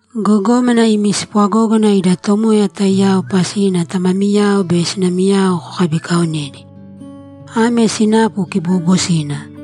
Gogómana, imi spwagógana ida Tomoya taiyao pasina tamamiyao be sinamiyao kokabikaonēdi. Ame sinapu kiboobosina.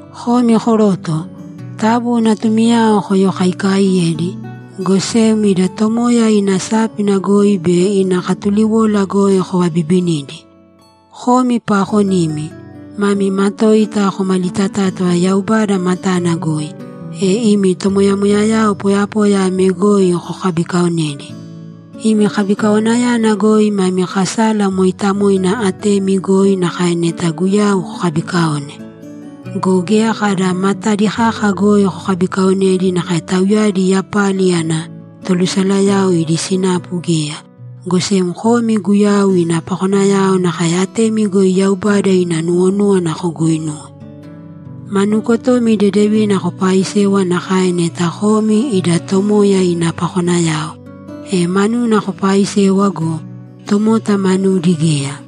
Komi koroto, taabu natumiyao koyokaikaaiyēdi, go sem ida Tomoya ina sápina goi be ina katuliwola goi kovabibinīdi. Komi paakonimi, mami matoita komalitatátava Yaubada matana goi, e imi tomoyamoyayao poyapoya ame goi kokabikaonēdi. Imi kabikawanayana goi mami kasala mooitamoina atemi goi nakae neta Guyau kokabikaone. Go geya kada matadi kaka goi kokabikaonēdi nakae tauyadi yapali ana tolusalayao idi sinapu geya, go sem komi Guyau ina pakonayao nakae atemi goi Yaubada ina nuwonúwana koguuinūwe. Ma nuukotomi dedevina kopaaisēwa nakae neta komi ida Tomoya ina pakonayao, e manuna kopaaisewa go, tomota manudi geya.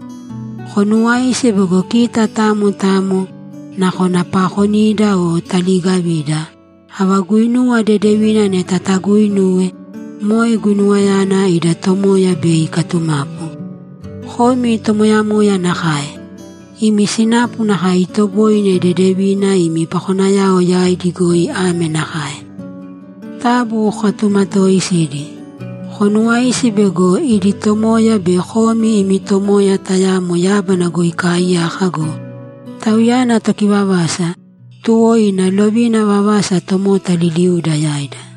Konuwāisi bego kita tamo tamo, nakona paakonida o taliigavida, ava guinuwa dedevina neta taguuinuwe, moe guinuwayana ida Tomoya bei ikatumapu. Komi tomoyamoya nakae. Imi sinapu nakae itoboine dedevina imi pakonayao yaidi goi ame nakae: Taabu kokatumatooisīdi. Konuwāisi bego idi Tomoya be komi imi Tomoya tayamo yábana goi ikaaiyaka go, Tauyana tokivavasa, tuwo ina lovina vavasa tomota liliuda yaida.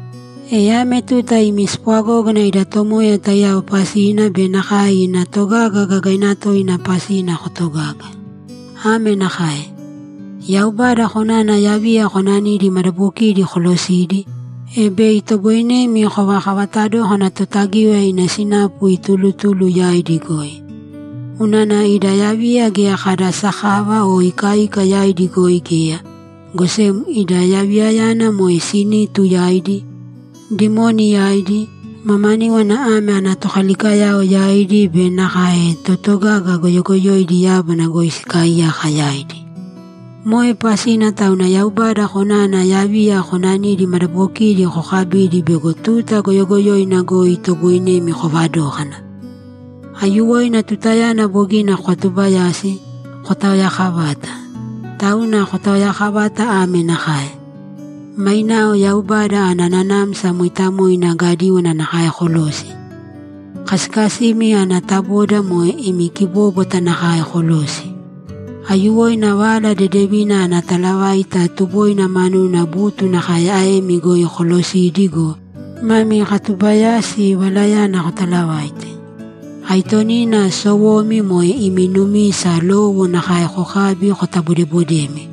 E ame tuta imi spwagógana ida Tomoya taiyao pasina be nakae ina togaga gagaina toina pasina kotogāga. Ame nakae: Yaubada konana yaviya konanidi madabokidi kolosīdi, e bei itoboinemi kovakavata dókana Totagíwaya ina sinapu itulutulu yaidi goi. Unana ida yaviya geya kada sakava o ikaika yaidi goi geya, go sem ida yaviyayana moe sinitu yaidi, dimoni yaidi, mamaníwana ame ana tokalikayao yaidi be nakae totogaga goyogoyoidi yábana goi sikaaiyaka yaidi. Moe pasina tauna Yaubada konana yaviya konanidi madabokidi kokabīdi bego tuta goyogoyoina goi itoboinemi kovadókana. Aiyuwoina tutayana bogina kokatubayasi, kotaoyakavāta. Tauna kotaoyakavāta ame nakae: Mainao Yaubada ana Nanamsa Mooitamoina gadíwana nakae kolōsi. Kasikasimi ana taboda moe imi kibóbwata nakae kolōsi. Aiyuwoina Vala Dedevina ana talavaita tuboina manuna butu nakae aemi goi kolosīdi go, mami katubayasi valayana kotalavāite. Aitonina sowomi moe imi numisa lowo nakae kokābi kotabodebodēmi;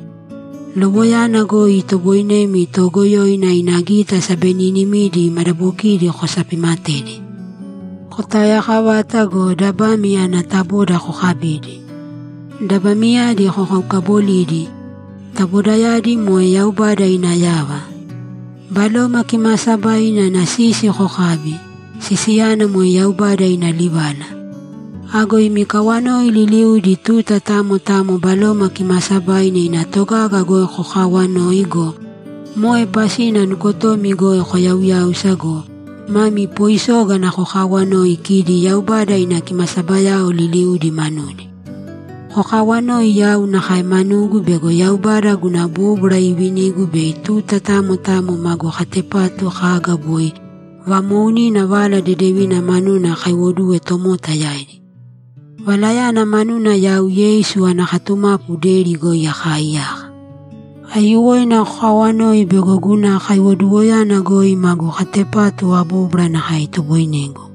lowoyana goi itoboinemi Toogoyoina ina gita sabeninimidi madabokidi kosapimatedi. Kotaoyakavāta go, dabami ana taboda kokabīdi, dabamiyadi kokaukabolīdi; tabodayadi moe Yaubada ina yava. Baloma Kimaasabaina ina sisi kokābi; sisiyana moe Yaubada ina livala. Ago imi kawanoi liliudi tuta tamo tamo Baloma Kimaasabaina ina togaga goi kokaawanōi go, moe pasina nukotomi goi koyauyāusa go, mami poisógana kokaawanōi kidi Yaubada ina kimasabayao liliudi manudi. Kokawanōi yau nakae manugu bego Yaubada guna bóbwara iivinigu bei tuta tamo tamo magu katepatu kaga boi vamoounina Vala Dedevina manuna akaiwoduwe tomota yaidi. Valayana manuna yau Yeisu ana katumapu deri goi akaaiyaka. Aiyuwoina kokaawanōi bego guna kaiwoduwoyana goi magu katepatu abóbwara nakae itoboinegu.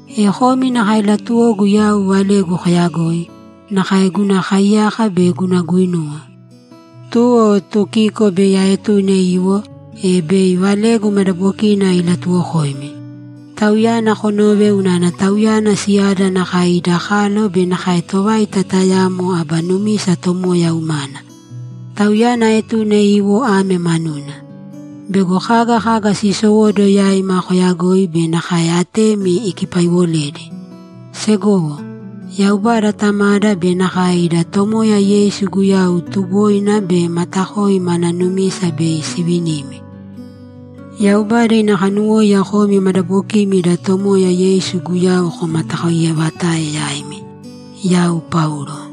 E komi nakae latuwogu yau valegu koyagoi, nakae guna kaiyaka be guna guinuwa. Tuwo Tukiko bei aetune iwo, e bei valegu madabokina ilatuwokoimi. Tauyana konōve unana tauyana siyada nakae ida kalo be nakae tovaita tayamo aba numisa Tomoya umana. Tauyana aetune iwo ame manuna: Bego kaga kaga siisowóduwo yaima koyagoi be nakae atemi ikipaiwoledi. Segowo, Yaubada Tamada be nakae ida Tomoya Yeisu Guyau tuboina be matakoi mana numisa bei sivinimi. Yaubada ina kanuwóiya komi madabokimi ida Tomoya Yeisu Guyau komatakoiyevatae yaimi. Yau Paulo